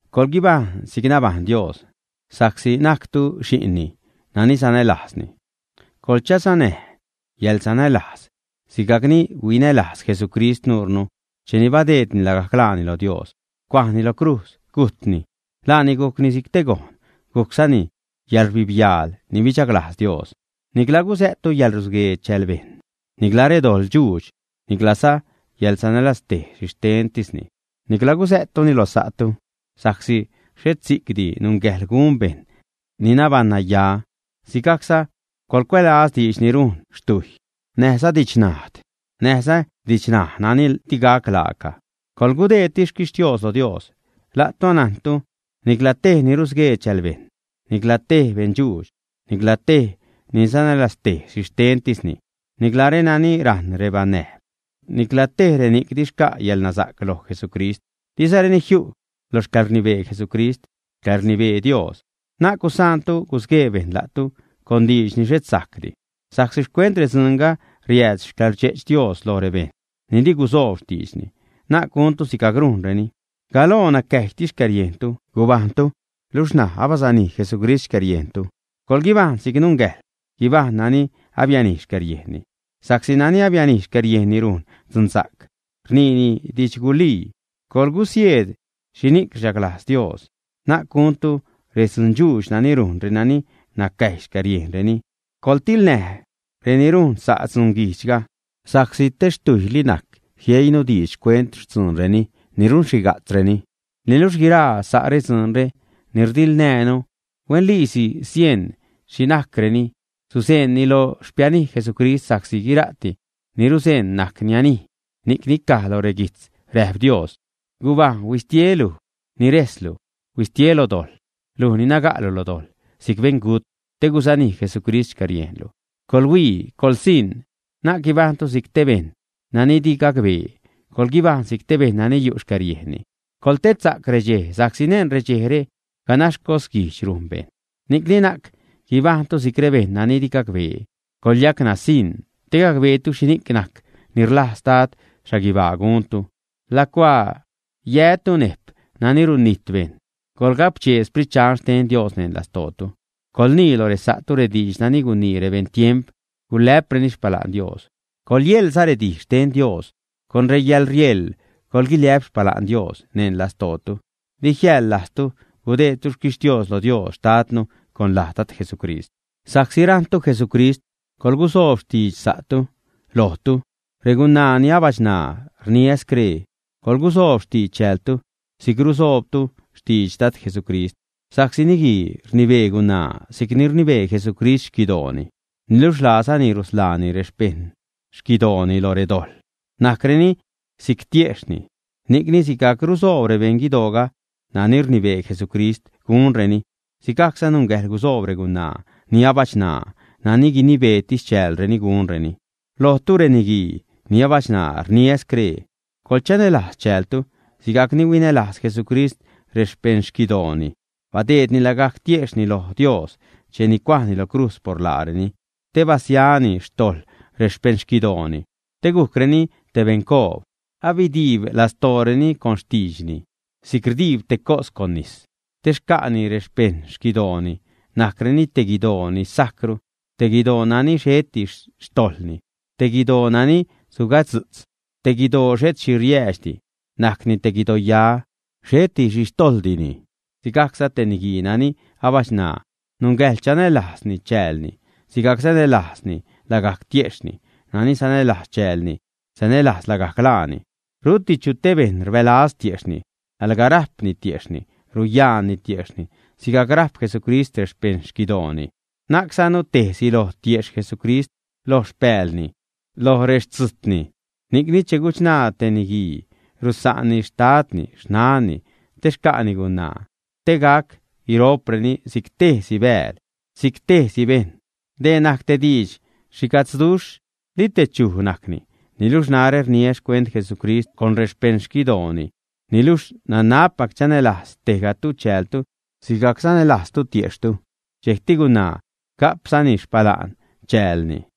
Coḻguibajṉ si'c nabajṉ Dios, sa'csi najctu xi'nni nani sanälajzni. Coḻchasanäj yäḻsanälajz sigajcni huinälajz Jesucrist nuure cheni badeedni lagajc laani lo Dios, cuajni lo crujz, gujtni. Laani gujcni si'c gojn, gujczani yäḻrbibyaal ni bidxaglajz Dios. Nicla gusä'ttu yäḻrusguee chääl bejṉ, nicla redoḻ dxuudx, niclaza yäḻsanälaztej xhixtentisni. Nicla gusä'ttuni lo sa'tu, sa'csi xhet si'cdi nungäjḻ gun bejṉ ni nabaṉ-naya. Sigajcza coḻcuälaz diidx ni rujn xtujy, näjza didxnajd, näjza didxṉaj nani digac laaca. Coḻgudeedtis xquixtios lo Dios. La'tu anajntu nicla tej ni rusguee chälbejṉ, nicla tej beṉdxuudx, nicla tej ni sanälaztej xhixtentisni, nicla renani rajṉ rebanäjb, nicla tej reni'c di xca' yäḻnasa'c loj Jesucrist, dizareni jiu' lo xcäḻrnibee Jesucrist, xcäḻrnibee Dios. Na'c gusaantu gusguee bejṉ la'tu con diidx ni xhet sajcdi sa'csi xcuent redzuunga riääd xcäḻrdxe'ch Dios loj rebejṉ ni di gusoob xtiidxni. Na'c guntu sigajc rujnreni. Galoo nacäjytis xcäriejntu gubajṉtu, luxh ṉaj abasanij Jesucrist xcäriejntu. Coḻguibajṉ si'c nungäjḻ guibajṉ nani abianij xcäriejnni. Sa'csi nani abianij xcäriejnni rujn dzunsa'c, rniini didxgulii. Coḻguisieed xhini'c rchaglajz Dios. Na'c guntu redzundxuudx nani rujn reni nacäjy xcäriejnreni, coḻtilnäj reni rujn sa' dzunguijdxga. Sa'csi te xtujyli najc jieinu diidx xcuent xtzuunreni ni runxhiga'tzreni. Niluxh guiraa sa' redzuunre ni rdiḻnäjnu, huenliisi sieṉ xhi najcreni, suzeṉni lo xpianij Jesucrist. Sa'csi guira'ti ni ruzeṉ najc nianij. Ni'cni caj loj reguijtz, räjp Dios: Gubajṉ, huistie luj ni rejslu. ¡Huistie lo dojḻ, luj ni naga'lu lo dojḻ si'c beṉgut, te gusanij Jesucrist xcäriejnlu! Coḻhuii, coḻsiṉ, na'c guibajṉtu si'c te bejṉ nani di gacbee, coḻguibajṉ si'c bejṉ nani yu' xcäriejnni. Coḻtedsa'c redxej sa'csi neṉ redxejre ganax cosguijdx rujn bejṉ. Ni'cni na'c guibajṉtu si'c rebejṉ nani di gacbee, coḻyacnasiṉ, te gacbeetu xhini'c najc ni rlajz Dad xhaguibaa guntu. Lacuaa yätu nejp nani runijt bejṉ, coḻgapchee Sprit Dxan xten Dios neṉ lastootu. Coḻnii loj resa'tu rediidx nani gunii rebejṉ tiemp gulä'preni xpala'n Dios, coḻyeḻza redij xten Dios, con reyäḻrieḻ coḻguiliä'p xpala'n Dios neṉ lastootu. Di jiäḻ lajztu gudeedtu xquixtios lo Dios xtadnu con laj Dad Jesucrist. Sa'csi rajṉtu Jesucrist, coḻgusoob xtidx sa'tu. Lojtu, regunaa ni abachṉaa, rniä scree: Coḻgusoob xtidx chäältu si'c rusoobzatu xtidx Dad Jesucrist. Sa'csi niguii rnibee gunaa si'cni rnibee Jesucrist xquidooni, niluxh laazani rusḻaani rexpejṉ guidooni lo redojḻ, najcreni si'c tiejxhni. Ni'cni, sigajc rusoob rebeṉ guidooga nani rnibee Jesucrist gunreni, sigajcza nungäjḻ gusoob regunaa ni abachṉaa nani guinibeetis chäälreni gunreni. Lojtu, reniguii ni abachṉaa rniä scree: Coḻchanälajz chäältu sigajc ni huinälajz Jesucrist rexpeṉ guidooni, badeedni lagajc tiejxhni loj Dios cheni cuajni lo crujz por laareni te basiani xtojḻ rexpejṉ guidooni, te gujcreni te beṉcoob, abidiib lastooreni con xtiidxni si'c rdiib te cos con nis te che xca'ni rexpeṉ guidooni, najcreni te guidoo ni sajcru, te guidoo nani xheti xtojḻni, te guidoo nani sugadzu'tz, te guidoo xhet xhi riäädxdi, najcni te guidoya, xheti xhi xtojḻdini. Sigajcza, te niguii nani abachṉaa nungäjḻ chanälajz chäälni sigajc sanälajzni lagajc tiejxhni. Nani sanälajz chäälni sanälajz lagajc laani. Ruti chu te bejṉ ni rbälaz tiejxhni; alga rajpni tiejxhni ruyaanni tiejxhni sigajc rajp Jesucrist rexpeṉ guidooni. Najczanu tejsi loj tiejxh Jesucrist, loj xpäälni, loj rextzujtni. “Ni'cni che guchṉaa te niguii rusa'nni xtadni, xnanni, te xca'ni gunaa, te gac guiro'preni si'c tejsi bääl, si'c tejsi bejṉ.” Dee najc te diidx xhiga'tzduxh; li te “¿chuj?” najcni. Niluxh narä rniä xcuent Jesucrist con rexpeṉguidooni. Niluxh nanabpac chanälajz tejgatu chäältu sigajc sanälajztu tiejxhtu. Dxejcti gunaa ga'pzani xpala'n chäälni.